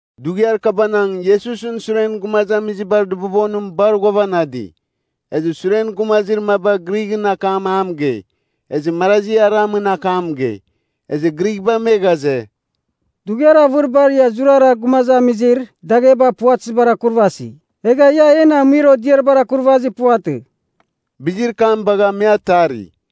Dughiar kabanang Iesusɨn suren gumazamizibar dɨbobonim bar ghuavanadi. Ezɨ suren gumazir maba Grighɨn akam a mɨgei, ezɨ marazi Aramɨn akam mɨgei. Ezɨ Grighba me ghaze, “Dughiar avɨriba ia zurara gumazamizir dagheba puvatɨzibar akurvasi, egha ia en amuir odiaribar akurvazir puvatɨ.” Bizir kam bagha me atari.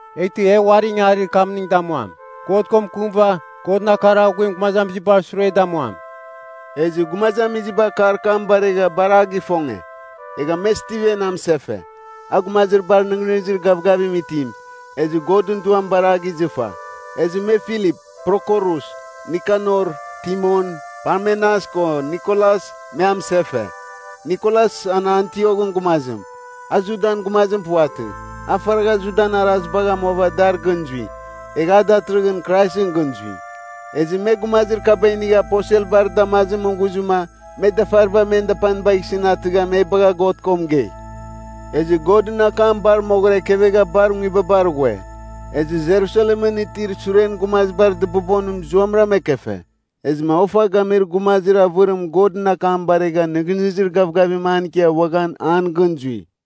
Eghtɨ e uari ingangarir kamning damuam, God ko mɨkɨmɨva, Godɨn akar aghuim gumazamizibar sure damuam.” Ezɨ gumazamiziba akar kam baregha bar a gifonge. Egha me Stiven amɨsefe, a gumazir bar nɨghnɨzir gavgavim itim, ezɨ Godɨn Duam bar a gizɨfa. Ezɨ me Filip, Prokorus, Nikanor, Timon, Parmenas ko Nikolas me amɨsefe. Nikolas an Antioghɨn gumazim, a Judan gumazim puvatɨ, a faragha Judan arazibagh amuava dar gɨn zui. Egha a datɨrɨghɨn Kraisɨn gɨn zui. Ezɨ me gumazir kaba inigha aposelbar damazimɨn ghuzɨma me dafariba men dapanibagh isɨn atɨgha me bagha God ko mɨgei. Ezɨ Godɨn akam bar moghɨra ekevegha bar nguibabar ghue. Ezɨ Jerusalemɨn itir suren gumazibar dɨbobonim zuamɨram ekefe. Ezɨma ofa gamir gumazir avɨrim Godɨn akam baregha nɨghnɨzir gavgavim an ikia uaghan an gɨn zui.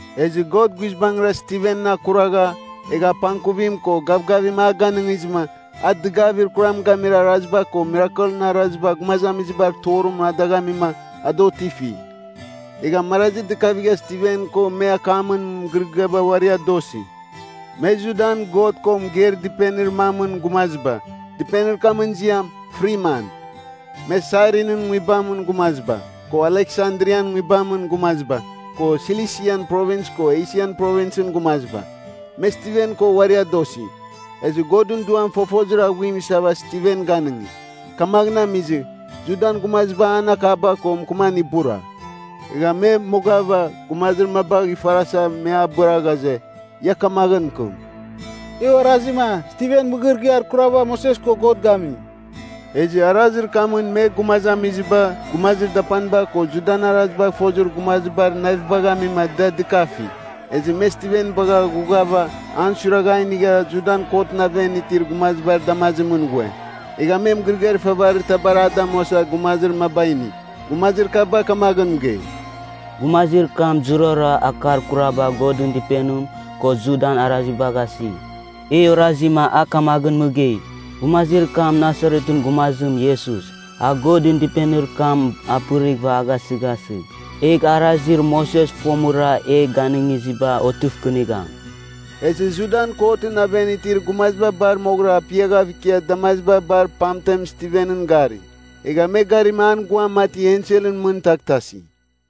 Ezɨ God guizbangɨra Stiven akuragha, egha apangkuvim ko gavgavim a ganɨngizɨma, a dɨgavir kuram gamir araziba ko mirakelɨn araziba gumazamizibar torimɨn a dagh amima a da otifi. Egha marazi dɨkavigha Stiven ko me akamɨn mɨgɨrɨgɨabar uari adosi. Me Judan God ko mɨgeir dɨpenir mamɨn gumaziba, dɨpenir kamɨn ziam, Friman. Me Sairinin nguibamɨn gumaziba, ko Aleksandrian nguibamɨn gumaziba, ko Silisian Provins ko Esian Provinsɨn gumaziba. Me Stiven ko uari adosi. Ezɨ Godɨn Duam fofozir aghuim isava Stiven ganɨngi. Kamaghɨn amizɨ, Judan gumaziba an akaba ko mɨkɨman ibura. Ezɨ me mogava, gumazir mabagh ifarasa me abɨra ghaze, ia kamaghɨn mɨkɨm, “E orazima Stiven mɨgɨrɨgɨar kurabar Moses ko God gami.” Ezɨ arazir kamɨn me gumazamiziba, gumazir dapaniba ko Judan arazibagh fozir gumazibar navibagh amima da dɨkafi. Ezɨ me Stiven bagha ghughava an suiragha a inigha Judan kotɨn aven itir gumazibar damazimɨn ghue. Egha me mɨgɨrɨgɨar ifavarir tabar a damuasa gumazir maba ini. Gumazir kaba kamaghɨn mɨgei, “Gumazir kam zurara akar kuraba Godɨn Dɨpenim ko Judan arazibagh asi. E orazima a kamaghɨn mɨgei, ‘Gumazir kam Nasaretɨn gumazim, Iesus, a Godɨn Dɨpenir kam apɨrighɨva a gasɨghasɨgh, egh arazir Moses fomɨra e ganɨngiziba otɨvkɨnigham.’” Ezɨ Judan kotɨn aven itir gumaziba bar moghɨra apiaghav ikiava damaziba bar pamtem Stiven gari. Egha me garima an guam mati enselɨn mɨn taghtasi.